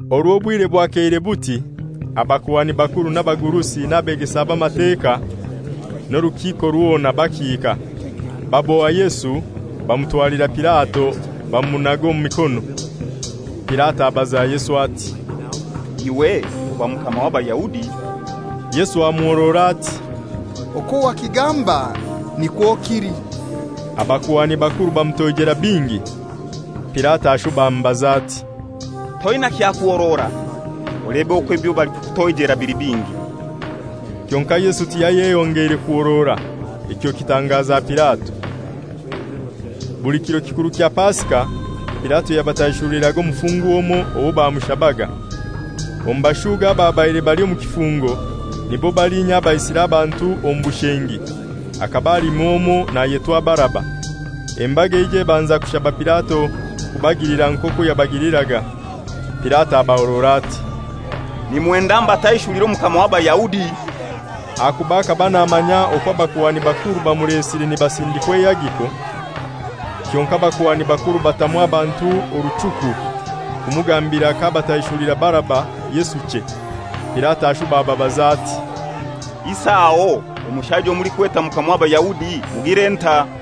Orwo obwire bwakeire buti, abakuhani bakuru, n'abagurusi, n'abegesa b'Amateka, n'orukiiko rwona bakiika. Baboha Yesu bamutwalira Pilato bamumunaga omu mikono. Pilato abaza Yesu ati, «Iwe oba mukama w'Abayahudi?» Yesu amuhorora ati, «Okwo wakigamba nikwo kili.» Abakuhani bakuru bamutoijera bingi. Pilato ashuba amubaza ati, «Toina kyakuhorora? Olebe okwo ebyo balikukutoijera bili bingi!» Kyonkai Yesu tiyayeyongeire kuhorora, ekyo kitangaza Pilato. Buli kiro kikuru kya Pasika, Pilato yabataishuliraga omufungwa omoi owo bamushabaga. Omu bashuuga ababaire bali omu kifungo, nibo balinya abaisire abantu omu bushengi, hakaba halimu omoi nayetwa Baraba. Embaga eija ebanza kushaba Pilato kubagilira nk'okwo yabagiliraga. Pilato abahorora ati, «Nimwenda mbataishulire Omukama w'Abayahudi?» Ahakuba akaba namanya okwo abakuhani bakuru bamulesire nibasindikwa eihagiko. Kyonkai abakuhani bakuru batamu abantu oruchuku kumugambira k'abataishulira Baraba, Yesu chei. Pilato ashuba ababaza ati, «Isi aho omushaija owo mulikweta Mukama w'Abayahudi mugire ntai?»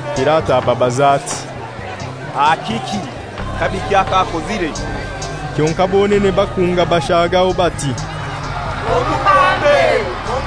Pilato ababaza ati, «Aha kiki? Kabiki ak'akozire?» Kyonkai bonene bakunga bashagaho bati, «Omubambe.»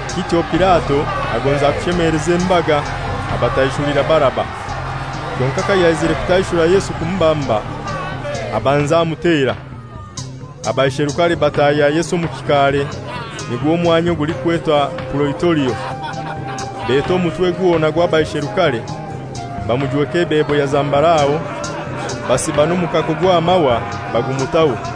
Kityo Pilato agonza kushemeleza embaga, abataishulira Baraba; kyonkai kayaizire kutaishura Yesu kumubamba, abanza amutera. Abaisherukare batahya Yesu omu kikaare (nigwo mwanya ogulikwetwa Puraitorio); beta omutwe gwona gw'abaisherukare. Bamujweka ebebo ya zambarau, basiba n'omukako gw'amahwa bagumutaho.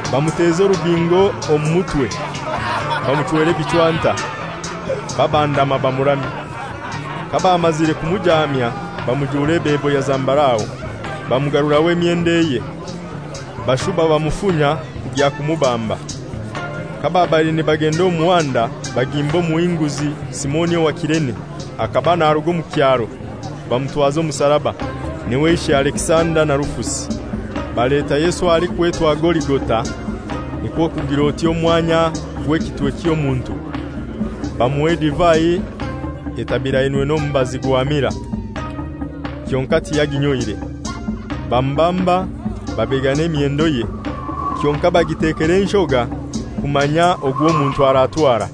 Bamuteza orubingo omu mutwe, bamuchwera ebichwanta, babandama bamuramya. Kabamazire kumujaamya bamujura ebebo ya zambarau, bamugaruraho emyendo eye. Bashuba bamufunya kugya kumubamba. Kababaire nibagenda omu muhanda bagimba omuhinguzi, Simoni owa Kirene, akaba naruga omu kyaro, bamutwaza omusaraba. N'iwe ishe Alekisanda na Rufusi. Baleta Yesu ahalikwetwa Goligota (nikwo kugir'oti omwanya gw'ekitwe ky'omuntu). Bamuha edivai etabirainwe n'omubazi gwa mira, kyonkai tiyaginyoire. Bamubamba, babegana emyendoye, kyonkai bagitekera enshoga kumanya ogw'omuntu aratwara.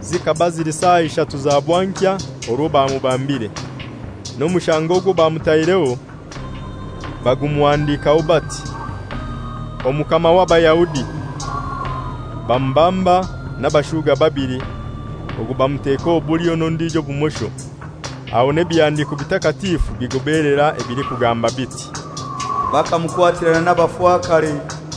Zikaba zili saa ishatu za bwankya orwo bamubambire. N'omushango ogwo bamutaireho bagumuhandikaho bati, «Omukama w'Abayahudi.» Bamubamba n'abashuga babili, ogu bamuteka obulyo n'ondijo obumosho. [ Aho n'ebihandiko bitakatifu bigobelera ebilikugamba biti, «Bakamukwatirana n'abafakare.»]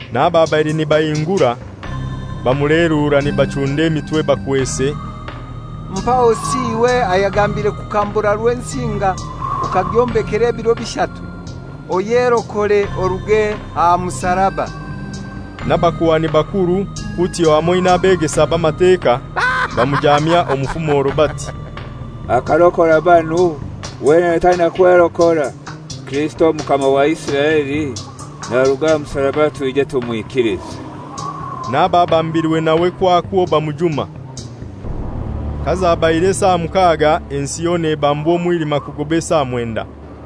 N'ababaire nibahingura bamuleerura nibachunda emitwe bakwese, «Mpahosi! Iwe ayagambiire kukambura Rwensinga okagyombekera ebiro bishatu, oyerokore oruge aha musaraba!» N'abakuhani bakuru kutyo hamoi n'abegesa b'Amateka bamujamya omu fumoro bati, «Akarokora banu, wenene taina kwerokora. Kirisito Omukama wa Isiraeli, naruge aha musaraba twije tumwikilize.» N'ababambirwe nawe kwakwo bamujuma. Kazabaire esaa mukaga ensi yona ebambwa omwilima kugoba esaa mwenda.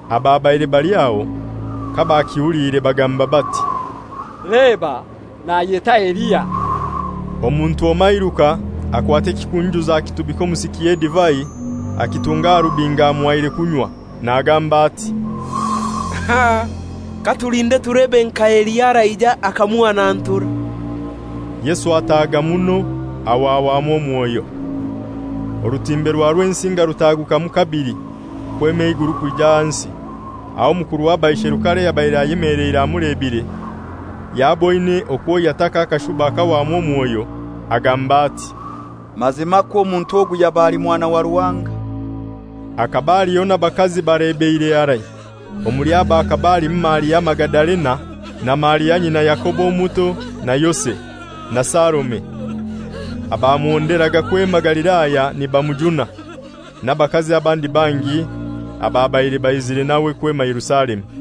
Ababaire bali aho kabakihuliire bagamba bati, «Leba, nayeta Eliya.» Omuntu omoi airuka, akwata ekikunjuzo akitubika omu siki y'edivai, akitunga aha rubingo omuhaire kunywa, nagamba ati, «Katulinde tulebe nka Eliya araija akamuhanantura.» Yesu ataaga muno, aho ahwamu omwoyo. Orutimbe rwa Rwensinga rutagukamu kabili, kwema eiguru kwija ahansi. Aho omukuru w'abaisherukare ayabaire ayemeleire amulebire, yaboine okwo yataka akashuba akahwamu omwoyo, agamba ati, «Mazimakwo omuntu ogu yaba ali Mwana wa Ruhanga!» Hakaba haliho n'abakazi balebeire harai, omuli abo akaba halimu Maria Magadalena, na Maria nyina Yakobo omuto na Yose, na Salome, abamuhonderaga kwema Galilaya nibamujuna; n'abakazi abandi bangi ababaire baizire nawe kwema Yerusalemu.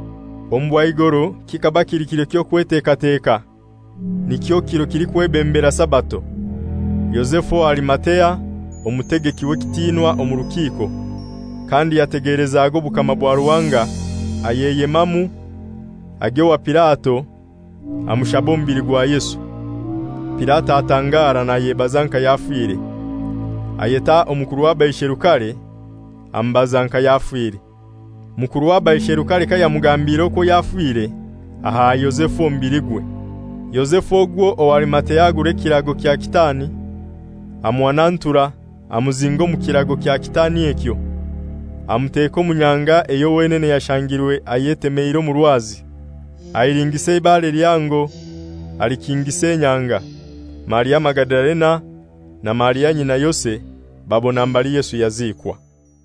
Omu bwaigoro kikaba kili kiro ky'okwetekateka, nikyo kiro kilikwebembera Sabato, Yozefu owa Arimatea, omutegeki w'ekitinwa omu rukiiko, kandi yategelezaga obukama bwa Ruhanga, ayeyemamu agya owa Pilato, amushaba omubili gwa Yesu. Pilato atangara nayebaza nka yafire. Ayeta omukuru w'abaisherukare, amubaza nka yafire. Mukuru w'abaisherukare kayamugambiire okwo yafire, aha Yozefu omubiligwe. Yozefu ogwo owa Arimatea agura ekirago kya kitaani, amuhanantura, amuzinga omu kirago kya kitaani ekyo, amuteka omu nyanga eyo wenene yashangirwe ayetemeire omu rwazi. Ahilingisa eibare lihango alikingisa enyanga. Maria Magadalena, na Maria nyina Yose, babona mbali Yesu yaziikwa.